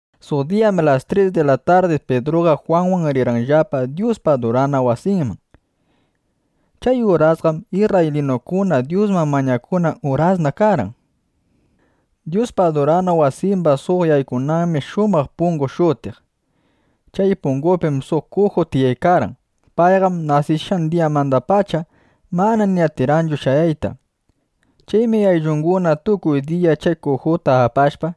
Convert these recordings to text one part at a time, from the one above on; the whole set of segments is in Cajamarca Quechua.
Suq diyam las tris di la tardi Pidruqa Jwanwan rirqanllapa Dyuspa adurana wasinman. Chay urasqam isrraylinukuna Dyusman mañakunan urasna karqan. Dyuspa adurana wasimba suq yaykunanmi “Shumaq Pungu” shutiq. Chay pungupim suq kuju tiyaykarqan. Payqam nasishqan diyamandapacha mana ni atirqanchu shayayta. Chaymi ayllunguna tukuy diya chay kujuta apashpa,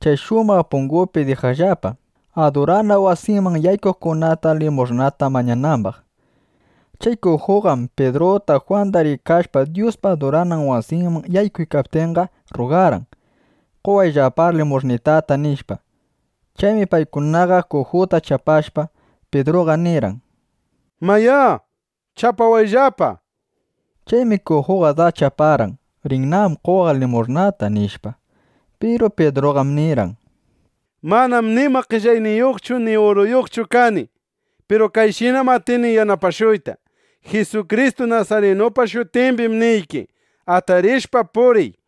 chay Shumaq Pungupi dijaqllapa, adurana wasiman yaykuqkunata limush'nata mañanambaq. Chay kujuqam Pidruta Jwanda rikashpa Dyuspa adurana wasinman yaykuykaptinqa, rrugarqan: —Qowayllapár limush'nitata, nishpa. Chaymi paykunaqa kujuta chapashpa, Pidruqa nirqan: —Mayá, chapawayllapa, nishpa. Chaymi kujuqa das chaparqan: Rinnam qowaq limush'nata, nishpa. Piru Pidruqam nirqan: —Manam nima qellayniyuqchu ni uruyuqchu kani. Piru kayshinam atini yanapashuyta: Jisukristu nasarinupa shutimbim niyki, atarishpa puriy, nishpa.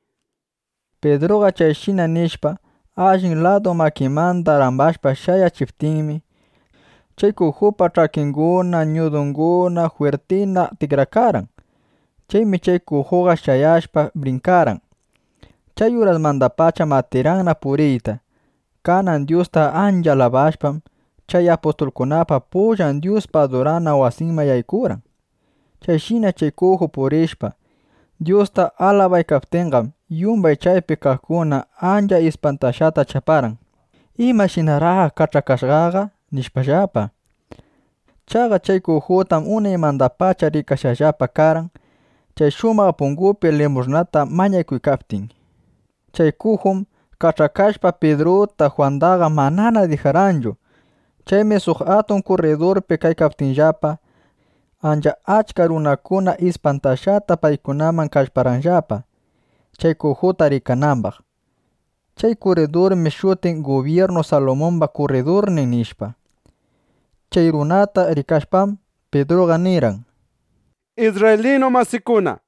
Pidruqa chayshina nishpa, allin ladu makinmanda rambashpa shayachiptinmi, chay kujupa ch'akinguna, ñudunguna jwirtina tikrakarqan. Chaymi chay kujuqa shayashpa, brinkarqan. Chay urasmandapacham atirqanna puriyta. Kanan Dyusta ancha alabashpam, chay apustulkunapa pullan Dyuspa adurana wasinman yaykurqan. Chayshina chay kuju purishpa, Dyusta alabaykaptinqam, yumbay chaypi kaqkuna ancha ispantashqata chaparqan: ¿Imashinaraq kach'akashqaqa? nishpallapa. Chaqa chay kujutaqam unaymandapacha rikashqallapa karqan, chay Shumaq Pungupi limush'nata mañakuykaptin. Chay kujum kach'akashpa, Pidruta, Jwandaqa manana dijarqanchu. Chaymi suq atun kurridurpi kaykaptinllapa, ancha achka runakuna ispantashqata paykunaman kallparqanllapa, chay kujuta rikanambaq. Chay kurridurmi shutiq “Gubyirnu Salumumba kurridurnin”, nishpa. Chay runakunata rikashpam, Pidruqa nirqan: —Isrraylinu masikuna,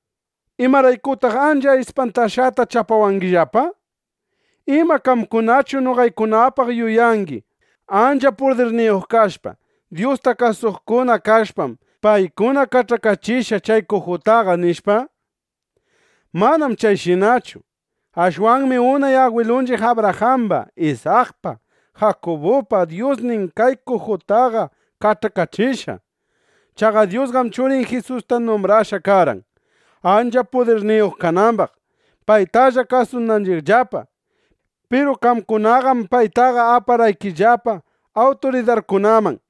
¿imaraykutaq ancha ispantashqata chapawangillapa? ¿Ima qamkunachu noqaykunapaq yuyangi: Ancha pudirniyuq kashpa, Dyusta kasuqkuna kashpam, paykuna kach'akachishqa chay kujutaqa, nishpa? Manam chayshinachu. Ashwanmi unay agwilunchiq Abrajamba, Isakpa, Jakubupa Dyusnin kay kujutaqa kach'akachishqa. Chaqa Dyusqam Churin Jisusta numbrashqa karqan, ancha pudirniyuq kanambaq, paytalla kasunanchiqllapa. Piru qamkunaqam paytaqa aparqaykillapa awturidarkunaman.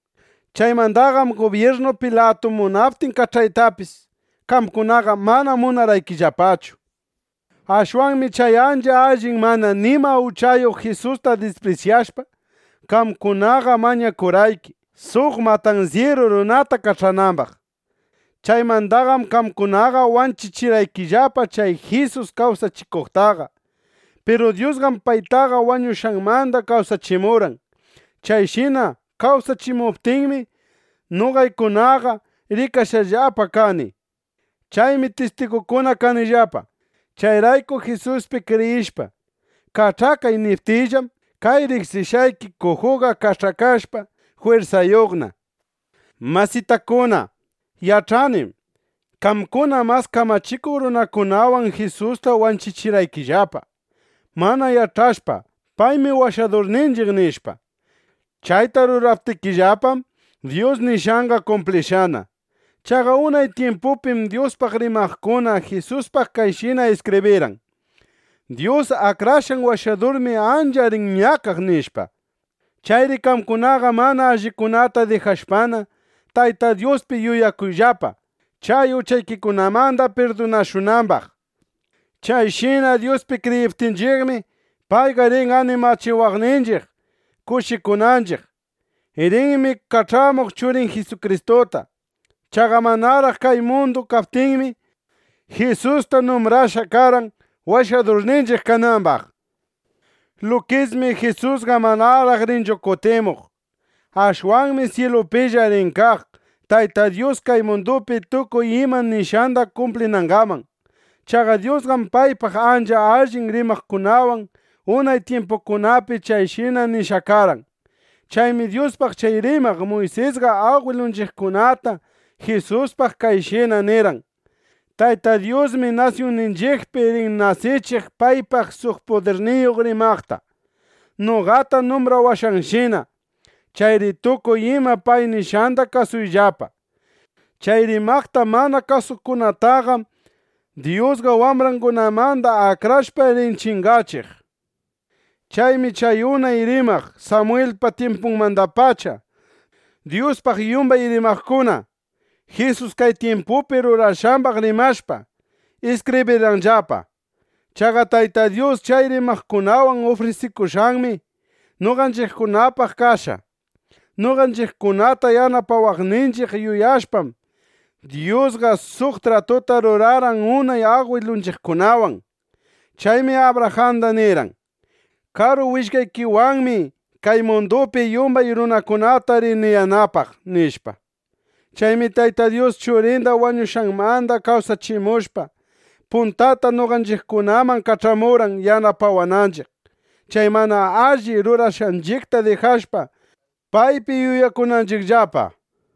Chaymandaqam Gubyirnu Pilatu munaptin kach'aytapis, qamkunaqa mana munarqaykillapachu. Ashwanmi chay ancha allin mana nima uchayuq Jisusta disprisyashpa, qamkunaqa mañakurqayki, suq matansyiru runata kach'anambaq. Chaymandaqam qamkunaqa wanchichirqaykillapa chay Jisus kawsachikuqtaqa. Piru Dyusqam paytaqa wañushqanmanda kawsachimurqan. Chayshina kawsachimuptinmi, noqaykunaqa rikashqallapa kani. Chaymi tistigunguna kanillapa. Chayrayku Jisuspi kriyishpa “Kach'akay” niptiyllam, kay riqsishqayki kujuqa kach'akashpa, jwirsayuqna. ’Masitakuna, yach'anim: Qamkuna mas kamachikuq runakunawan Jisusta wanchichirqaykillapa, mana yach'ashpa: Paymi Washadurninchiq, nishpa. Chayta ruraptikillapam, Dyus nishqanqa kumplishqana. Chaqa unay tyimpupim Dyuspaq rimaqkuna Jisuspaq kayshina iskibrirqan: “Dyus Akrashqan Washadurmi ancha rin ñakaq”, nishpa. Chayri qamkunaqa mana allikunata dijashpana, Tayta Dyuspi yuyakuyllapa, chay uchaykikunamanda pirdunashunambaq. Chayshina Dyuspi kriyiptinchiqmi, payqa rin animachiwaqninchiq kushikunanchiq. Rinmi kach'amuq Churin Jisukristuta. Chaqa manaraq kay mundu kaptinmi, Jisusta numbrashqa karqan, Washadurninchiq kanambaq. Lukismi Jisusqa manaraq rinchu kutimuq. Ashwanmi syilupilla rin kaq, Tayta Dyus kay mundupi tukuy ima nishqanda kumplinangaman. Chaqa Dyusqam paypaq ancha allin rimaqkunawan unay tyimpukunapi chayshina nishqa karqan. Chaymi Dyuspaq chay rimaq Muysisqa agwilunchiqkunata Jisuspaq kayshina nirqan: “Tayta Dyusmi nasyunninchiqpi rin nasichiq paypaq suq pudirniyuq rimaqta, noqata numbrawashqanshina. Chayri tukuy ima pay nishqanda kasuyllapa. Chay rimaqta mana kasuqkunataqam Dyusqa wambrangunamanda akrashpa, rin chingachiq”, nishpa. ’Chaymi chay unay rimaq Samwilpa tyimpunmandapacha, Dyuspaq yumbay rimaqkuna Jisus kay tyimpupi rurashqambaq rimashpa, iskibrirqanllapa. Chaqa Tayta Dyus chay rimaqkunawan ufrisikushqanmi noqanchiqkunapaq kashqa. Noqanchiqkunata yanapawananchiq yuyashpam, Dyusqa suq tratuta rurarqan unay agwilunchiqkunawan. Chaymi Abrajanda nirqan: “Karu willkaykiwanmi kay mundupi yumbay runakunata rini yanapaq”, nishpa. Chaymi Tayta Dyus Churinda wañushqanmanda kawsachimushpa, puntata noqanchiqkunaman kach'amurqan yanapawananchiq, chay mana alli rurashqanchiqta dijashpa, paypi yuyakunanchiqllapa, nishpa.